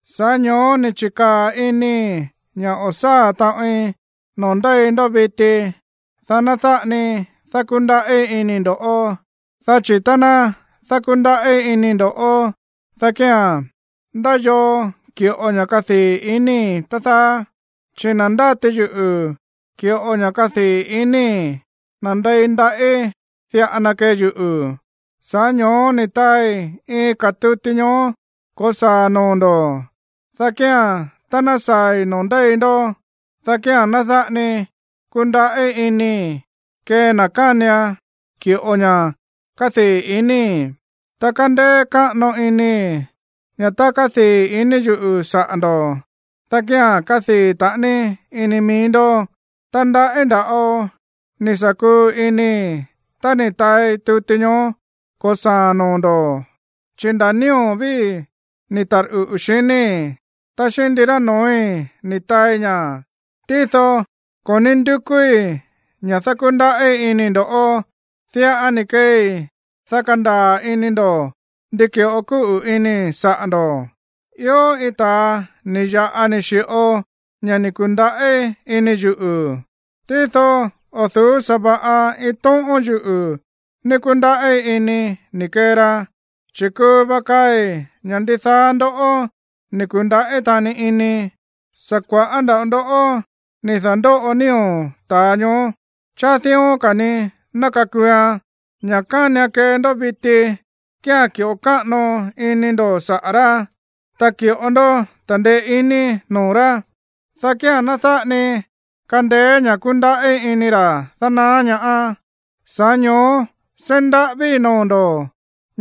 Sa̱ꞌá ño̱ó ni̱ chi̱kaa̱ inii̱ ña̱ o̱ sáa̱ taꞌoin noo̱ ndéi ndó viti, dá ná dáꞌa ni dákúndaꞌí inii̱ ndo̱ꞌó. Dá chi̱ tá ná dákúndaꞌí inii̱ ndo̱ꞌó, dá kía̱n, ¿ndá yoo ki̱ꞌo ña̱ kadii̱ iníi̱, tá dáá? Chi̱ na̱ ndáti yuꞌu̱ ki̱ꞌo ña̱ kadii̱ iníi̱, nandei ndaꞌí diꞌa na kee yuꞌu̱. Sa̱ꞌá ño̱ó ni̱ taai iin ka̱ tuti ñoó ko̱saa̱a̱n noo̱ ndo̱, dá kía̱n tá ná saa̱i̱ noo̱ ndéi ndó, dá kía̱n ná dáꞌa ni kundaꞌí inii̱ kee na̱ kánian ki̱ꞌo ña̱ kadii̱ iníi̱. Ta kándéé káꞌano inii̱ ña̱ tá kadii̱ ini yuꞌu̱ saꞌa̱ ndo̱, dá kía̱n kadii̱ taꞌani ini mií ndó. Ta ndaꞌí nda̱ꞌo ni̱ sa̱ kuu inii̱ tá ni̱ taai tuti ñoó ko̱saa̱a̱n noo̱ ndo̱, chi nda̱ nío̱ víi̱ ni̱ tarꞌuꞌu̱, xiníi̱, ta xíꞌín ndirá noo̱í ni̱ taai ña̱. Tído ko̱ ní ndukúí ña̱ dákúndaꞌí inii̱ ndó. Diꞌa ni̱ keei, dá kandaa̱ ini ndo̱ ndi ki̱ꞌo kúꞌu̱ inii̱ saꞌa̱ ndo̱. Ió iin ta̱a ni̱ ya̱ꞌa ni̱ xi̱ꞌo ña̱ ni̱ ku̱ndaꞌí ini yuꞌu̱, tído o̱ du̱ú sa̱va̱ꞌa iin tóꞌón yuꞌu̱ ní kúndaꞌí inii̱ ni̱ kee ra, chi̱ kuu va kaai̱ ña̱ ndidaá ndoꞌó ni̱ ku̱ndaꞌí taꞌani ini. Sa̱ kua̱ꞌá nda̱ꞌo ndó ni̱ da̱ndóꞌo nío̱ ta̱a ñoó. Cháá dión ka̱ ni ná kakuuan. Ña̱ kánian kee ndó viti kía̱n ki̱ꞌo káꞌano ini ndo̱ saꞌa̱ rá, ta ki̱ꞌo ndó ta̱ndeé iní noo̱ rá, dá kía̱n ná dáꞌa ni kandeé ña̱ kundaꞌí ini ra̱ dánaá ñaá. Sa̱ꞌá ño̱ó seí ndaꞌávíi̱ noo̱ ndo̱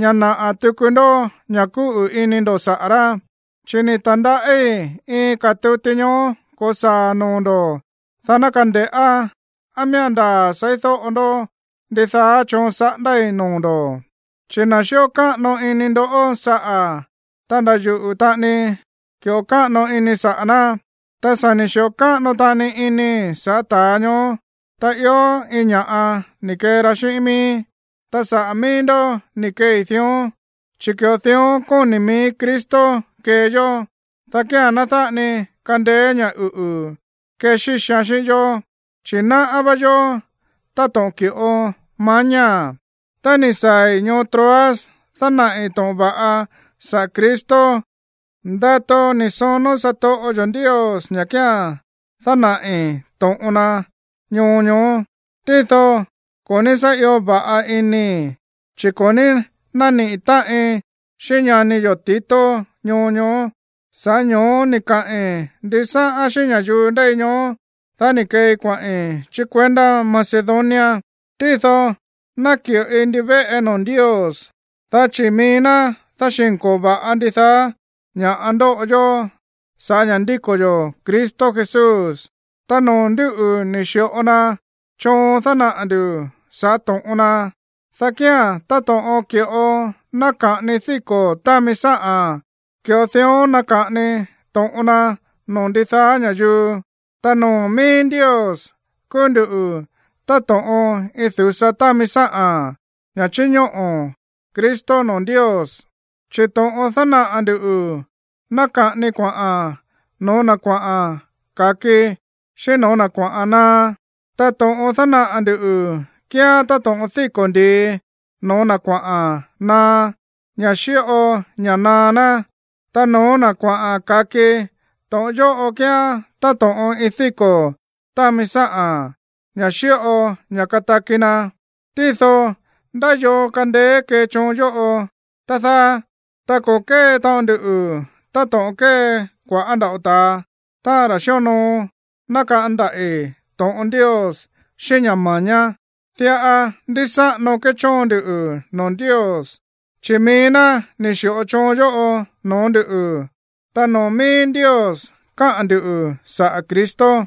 ña̱ naꞌa̱ tuku ndó ña̱ kúꞌu̱ ini ndo̱ saꞌa̱ rá. Chi̱ ni̱ ta̱ndaꞌí iin ka̱ tuti ñoó ko̱saa̱ noo̱ ndo̱, dá ná kande̱ꞌá á miía̱n ndaa̱ seídóꞌo ndó ndidaá choon saꞌándái̱ noo̱ ndo̱. Chi̱ na̱ xíꞌo káꞌano ini ndo̱ saꞌa̱, ta nda̱ yuꞌu̱ taꞌani ki̱ꞌo káꞌano inii̱ saꞌa̱ ná. Ta sa̱ ni̱ xi̱ꞌo káꞌano taꞌani inii̱ sa̱ꞌá ta̱a ñoó tá ió iin ña̱ꞌa ni̱ kee ra xíꞌín miíí, ta sa̱ꞌá mií ndó ni̱ keei dión, chi̱ ki̱ꞌo dión kóni̱ mií Cristo kee yó, dá kía̱n ná dáꞌa ni kandeé ña̱ uꞌu̱ kexíxian xíꞌín yó, chi̱ sa̱ náꞌá vá yó táto̱ꞌon ki̱ꞌo mañáa̱n. Tá ni̱ saa̱i̱ ñoo Troas dánaꞌi̱ to̱ꞌon va̱ꞌa saꞌa̱ Cristo, ndato ni̱ sonó satoꞌo yo̱ Ndios ña̱ kía̱n dánaꞌi̱ to̱ꞌon na ñoo ñoó. Tído ko̱ ní sá io va̱ꞌa inii̱, chi̱ ko̱ ní nániꞌi̱ táꞌin xíꞌín ñani yo̱ Tito ñoo ñoó. Sa̱ꞌá ño̱ó ni̱ kaꞌi̱n ndisáꞌán xíꞌín ña̱yuu ndéi ñoó, dá ni̱ keei kuaꞌi̱n chí kuendá Macedonia. Tído náki̱ꞌoi ndivéꞌe noo̱ Ndios, dá chi̱ mií ná dáxi̱nko̱o va̱ꞌa ndidaá ña̱ꞌa ndóꞌo yó sa̱ꞌá ña̱ ndíko̱ yo̱ Cristo Jesús. Ta noo̱ ndúꞌu̱ ni̱ xi̱ꞌo na choon dánaꞌa̱ ndu̱ sa̱ꞌá to̱ꞌon na, dá kía̱n táto̱ꞌon ki̱ꞌo náka̱ꞌani díko̱ támi sáꞌa̱n, ki̱ꞌo di̱ꞌón náka̱ꞌani to̱ꞌon na noo̱ ndidaá ña̱yuu. Ta noo̱ míí Ndios kúú nduꞌu̱ táto̱ꞌon iin du̱sa támi sáꞌa̱n, ña̱ chíñóꞌo̱ Cristo noo̱ Ndios. Chi̱ to̱ꞌon dánaꞌa̱ ndu̱ náka̱ꞌani kuaꞌa̱n no̱ó na̱ kuaꞌa̱n ka̱ki, xíꞌín no̱ó na̱ kuaꞌa̱n naá. Ta to̱ꞌon dánaꞌa̱ ndu̱ kíán táto̱ꞌon díko̱ ndi̱i no̱ó na̱ kuaꞌa̱n naá, ña̱ xíꞌo ña̱ naá ná. Ta no̱ó na̱ kuaꞌa̱n ka̱ki, to̱ꞌon yóꞌo kíán táto̱ꞌon iin díko̱ támi sáꞌa̱n, ña̱ xíꞌo ña̱ kataki na̱. Tído, ¿ndá yoo kandeé kee choon yóꞌo, tá dáá? Ta ko̱ kée taꞌon nduꞌu̱ táto̱ꞌon kée kua̱ꞌá nda̱ꞌo ta̱a, táꞌa̱n ra̱ xíonoo nákaꞌán ndaꞌi̱ to̱ꞌon Ndios xíꞌín ña̱ ma̱ñá. Diꞌa ndísáꞌano kéchóon ndu noo̱ Ndios, chi̱ mií ná ni̱ xi̱ꞌo choon yóꞌo no̱ó ndu̱, ta noo̱ mií Ndios káꞌa̱n ndu̱ saꞌa̱ Cristo.